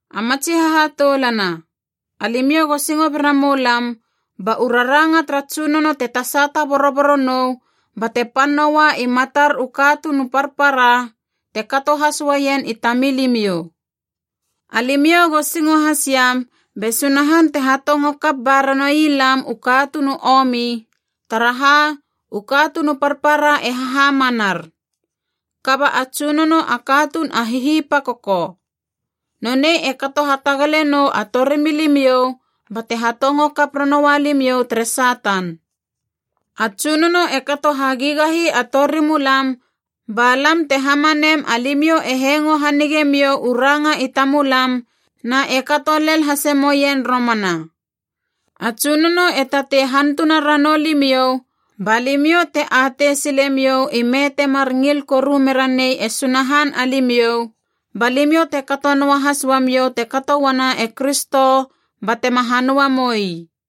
A matsi hahatoulana, alimiou go singo bera moulam ba u raranga tara Tsunono te tasata boroboro nou bate pan noua i matar u katuun u parpara, te kato has uaien i tamilimiou. Alimiou go singo has iam be Sunahan te hatongo kap ba ranoui lam u katuun u omi, taraha u katuun u parpara e hahamanar. Kaba a Tsunono a katuun a hihipakoko. Nonei e kato hatagale nou a torimilimiou bate hatongo kap ranoua limiou tere Satan. A Tsunono e kato hagigahi a torimulam ba lam te hamanem alimiou e hengo hanige miou u ranga i tamulam na e kato lel hasemoien romana. A Tsunono e tatei hantuna ranou limiou ba limiou te atei silemiou ime temar ngil koru mera nei e Sunahan alimiou, ba limiou te kato noahas uamiou te kato uana e Kristo batema hanöa moi.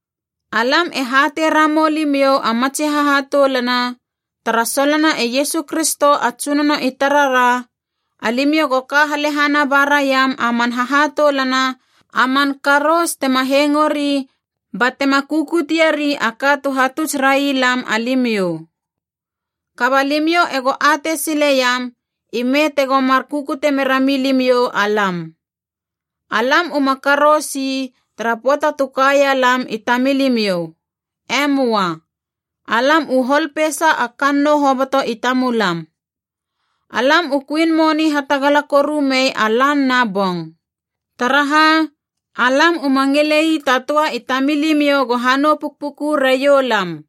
Alam e hatei ramou limiou a matsi hahatoulana, tara solona e Iesu Kristo a Tsunono i tarara, alimiou go ka halehana ba raiam a man hahatoulana a man karous tema hengori batema kukutie ri a ka tu hatuts railam alimiou. Kaba limiou ego atei sileiam i me tego mar kukute merami limiou alam. Alam uma karous ii tara pöata tu kaia lam i tamilimiou. E möa. Alam u hol peisa a kannou hoboto i tamulam. Alam u kuin moni hatagala koru mei a lan na bong. Taraha, alam uma ngilei ta töa i tamilimiou go hanou pukpuku raiou lam.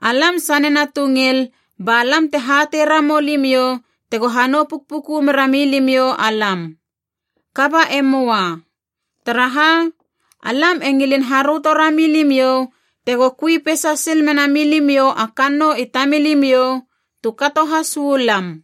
Alam sanena tu ngil ba lam te hatei ramou limiou tego hanou pukpuku merami limiou alam. Kaba e möa. Taraha, alam e ngilin haröto rami limiou tego kui peisa sil mena milimiou a kannou i tamilimiou, tu kato has uu lam.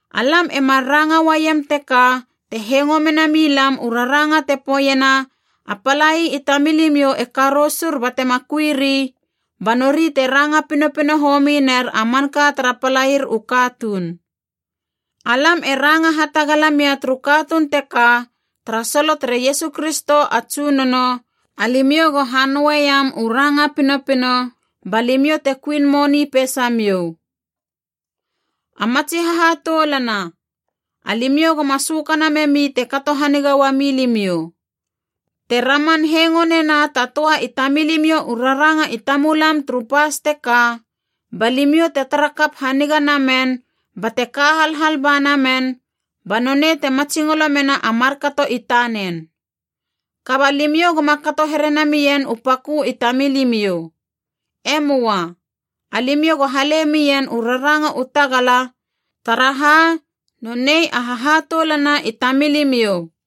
Alam e mar ranga uaiem teka te hengo mena milam u raranga te poeiena a palai i tamilimiou e karousur batema kuiri, ba nori te ranga pinopino homi ner a manka tara palair u katuun. Alam e ranga hatagala mia turu katuun teka tara solo tere Iesu Kristo a Tsunono, alimiou go hanoeiam u ranga pinopino ba limiou te kuin moni peisamiou. A matsi hahatoulana, alimiou goma sökana memi te kato haniga uami limiou. Te raman hengo nena ta töa i tamilimiou u raranga i tamulam turu pas teka, balimiou te tara kap haniga namen bate ka halhal ba namen, ba nonei te matsingolo mena a markato i tanen. Kaba limiou goma kato here namien u pakö i tamilimiou. E möa. Alimiou go hale mien u raranga u tagala, taraha nonei a hahatoulana i tamilimiou.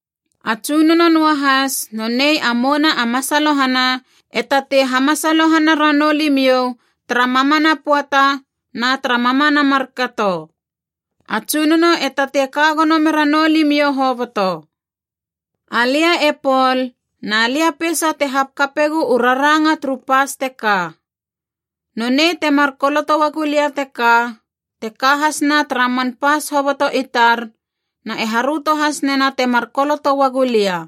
A Tsunono noahas, nonei a mouna a masalohana, e tatei hamasalohana ranou limiou tara mamana pöata na tara mamana markato. A Tsunono e tatei ka gono mera noulimiou hoboto. Alia e Pol, na lia peisa te hakapegu u raranga turu pas teka. Nonei temar koloto uagulia teka, te ka hasna tara man pas hoboto i tar na e haröto has nena temar koloto uagua lia.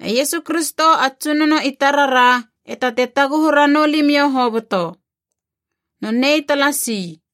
E Iesu Kristo a Tsunono i tarara e tatei taguhu ranou limiou hoboto. Nonei talasi.